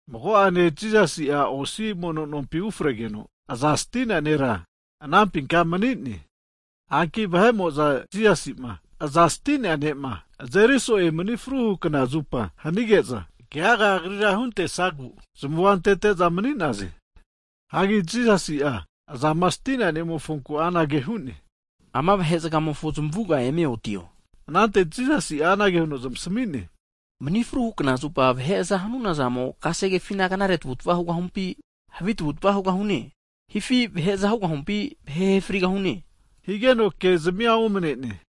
Mago'ane Jisasi'a osi mono nompi ufregeno, aza stinea nera anampinka mani'ne. Hagi vahe'mo'za Jisasi'ma aza stinea ne'ma azeri so'e mani fruhu knazupa hanige'za, keagama Agrira huntesagu zamua antete'za mani'naze. Hagi Jisasi'a azama sti'nea ne'mofonku anage hu'ne, Ama vahe'zagamofo zamavuga eme otio! Anante Jisasi'a anage huno zamasami'ne, Mani fruhu knazupa vahe aza hanuna zamo'a kasegefina knare tavutava hugahumpi, havi tavutva hugahune, hifi vahe aza hugahumpi, vahe ahe frigahune? Higeno ke'zamia omane'ne.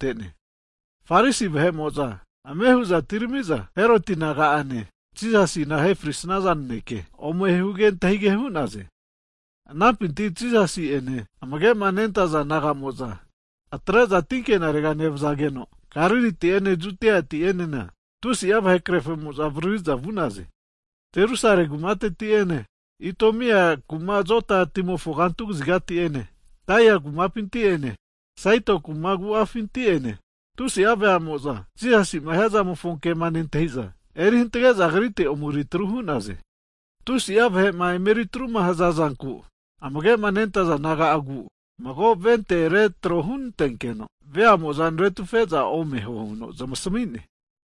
Anama hige'za Farisi vahe'mo'za ame hu'za atirami'za Heroti naga'ene Jisasima ahe frisnaza naneke ome huge antahige hu'naze. Hagi anampinti Jisasi'ene amage'ma nentaza disaipol naga'mo'za atre'za tinkenarega nevazageno, Galiliti'ene Judiati'enena tusi'a vahe krerfamo'za avaririza vu'naze. Jerusalemi kumateti'ene, Itumia kuma Jodani timofo kantu kazigati'ene Tairi kumapinti ene Saidoni kuma agu'afinti'ene tusi'a veamo'za Jisasi'ma hiazamofo kema nentahiza, erihantge'za Agrite omeri atru hu'naze. Hagi tusi'a vahe'ma emetruma hazazanku, amage'ma nentaza disaipol naga'agu mago voti retro hunantenkeno veamo'za naretufe'za omeho huno zmasamine.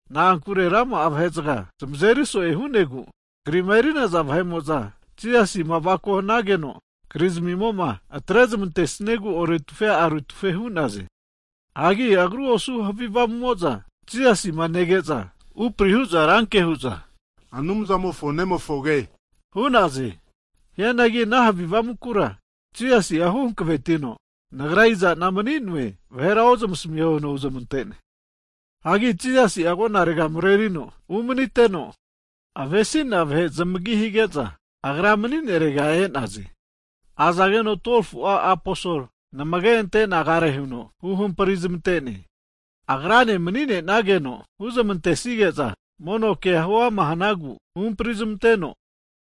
Na'ankure rama'a vahezagama zamazeri so'e hu'negu, krima eri'naza vahe'mo'za Jisasima avako hanageno kri zamimo'a atre zamantesiegu oretufe aretufe hu'naze. Hagi agru osu havi avamu'mo'za, Jisasi'ma nege'za upri hu'za ranke hu'za, Anumzamofo nemofoge hu'naze. Hianagi ana havi avamukura Jisasi'a huhankavetino, Nagra iza'na mani'noe vahera ozmasamiho huno huzmante'ne. Hagi Jisasi'a agonarega marerino umaniteno, avesi'nea vaheke zamagi hige'za agra mani'nerega e'naze. Azageno 12fu'a aposol namage'ante nagare huno huhampri zmantene. Agrane mani'ne'nageno huzmantesige'za mono kea huama hanagu huhampri nezmanteno,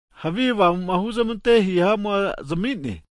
havi avamu'ma huzmante hihamua zami'ne.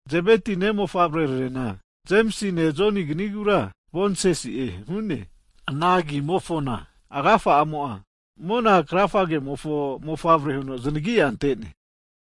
Zebeti mofavre'rarena, Jemisine Joni kizanigura Boaneges'ne, ana agimofona agafa'amo'a mona krafagemofo Mofavre huno znagia ante'ne.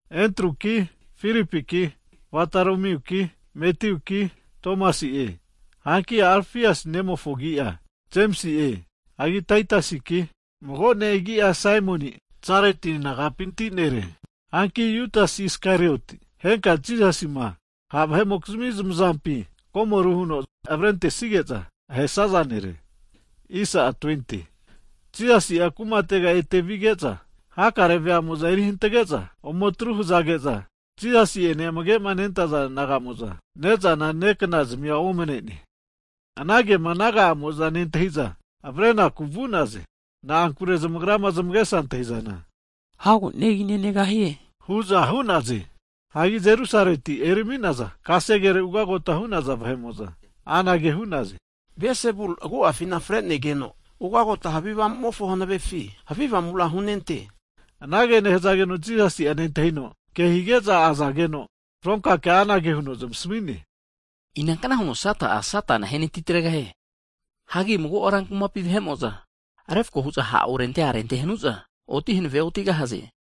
Hagi Endruki, Filipiki, Vatoromuki, Matiuki Tomasi'e, hanki Arafiasi nemofo agi'a Jemisi'e. Hagi Tatiasiki, mago ne' agi'a Saimoni'a Zelati nagapinti nere. Hanki Judasi Isakariotikino, henka'a Jisasima ha' vahe'amokizmi zamazampi komoru huno avrentesige'za ahesaza nere. Hagi Jisasi'a kumatega ete vige'za, hakare veamo'za eri hantage'za ome atru hazage'za, Jisasi'ene amage'ma nentaza disaipol naga'mo'za ne'za neknazmia omanene. Ana kema naga'amo'za nentahiza avrenaku vu'naze. Na'ankure zamagra'ma zamagesama antahi'zana hago negi nenegahie hu'za hu'naze. Hagi Jerusaleti erami'naza kasegere ugagota hu'naza vahe'mo'za anage hu'naze. Belsebuli agu'afi fre'negeno, ugagota havi Avamumofo hanavefi, havi avamura hunente hu'naze. Anage nehazageno Jisasi'a nentahino, kehige'za azageno fronka kea anage huno zamasmi'ne, Inankna huno Sata'a, Satana ahenanti tregahie? Hagi mago rankumapi vahe'mo'za refko hu'za ha' orente arente hanu'za oti hanave otigahaze.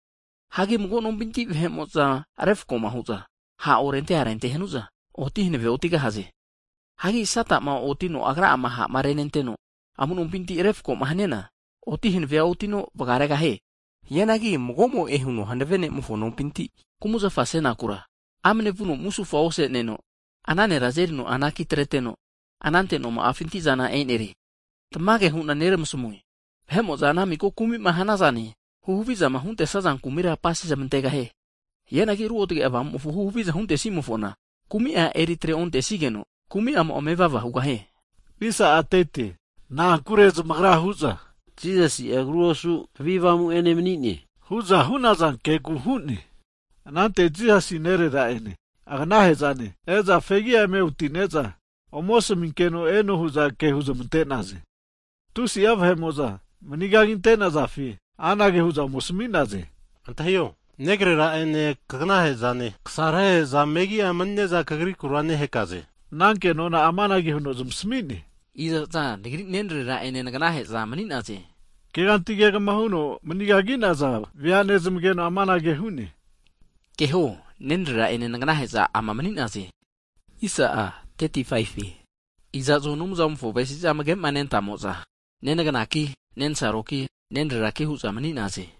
Hagi mago nompi vahe'mo'za refko'ma hu'za ha' orente arente hanu'za, oti hanave otigahaze. Hagi Sata'ma otinoma agra'ama ha'ma renenteno, amu'nompinti refko'ma haniana, oti hanave otino vagaregahie. Hianagi mago'mo'e huno hanave ne'mofo nompinti kumzafama asenakura, amane vuno musufa ose'neno, ana nera azerino anaki atreteno, anante noma'afinti'zana enerie. Tamage hu'na neramasmue, Anumzamo'a vahe'mo'za ana miko kumi'ma hanaza zane huhavizama huntesaza kumira apase zamantegahie. Hianagi Ruotge Avamumofo huhaviza huntesimofona, kumi'a eri atre ontesigeno, kumi'amo'a mevava hugahie. Na'ankure zamagra hu'za, Jisasi'a agru osuno havi avamu ene mani'ne hu'za hu'naza kegu hu'ne. Hagi anante Jisasi nerera'ene aganahe'zane e'za fegi'a eme oti'neza, ome asaminkeno eno hu'za ke huzmante'naze. Anante tusi'a vahe'mo'za mani kaginte'nazafi anage hu'za ome asami'naze, antahio, negarera'ene kaganahe'zane kasarahe'za megia mani'ne'za kagriku ke nehaze. Hazageno ana kenona'a amanage huno zamasami'ne, Iza'za nagri nenrera'ene naganahe'za mani'naze? Keganti kegama huno manigagi'naza vea nezmageno anage hu'ne, Keho, nenrera'ene naganahe'za ama mani'naze. Hagi iza'zo Anumzamofo avesizama amage'ma nentamo'za, nenaganaki nensaroki nenreraki hu'za mani'naze.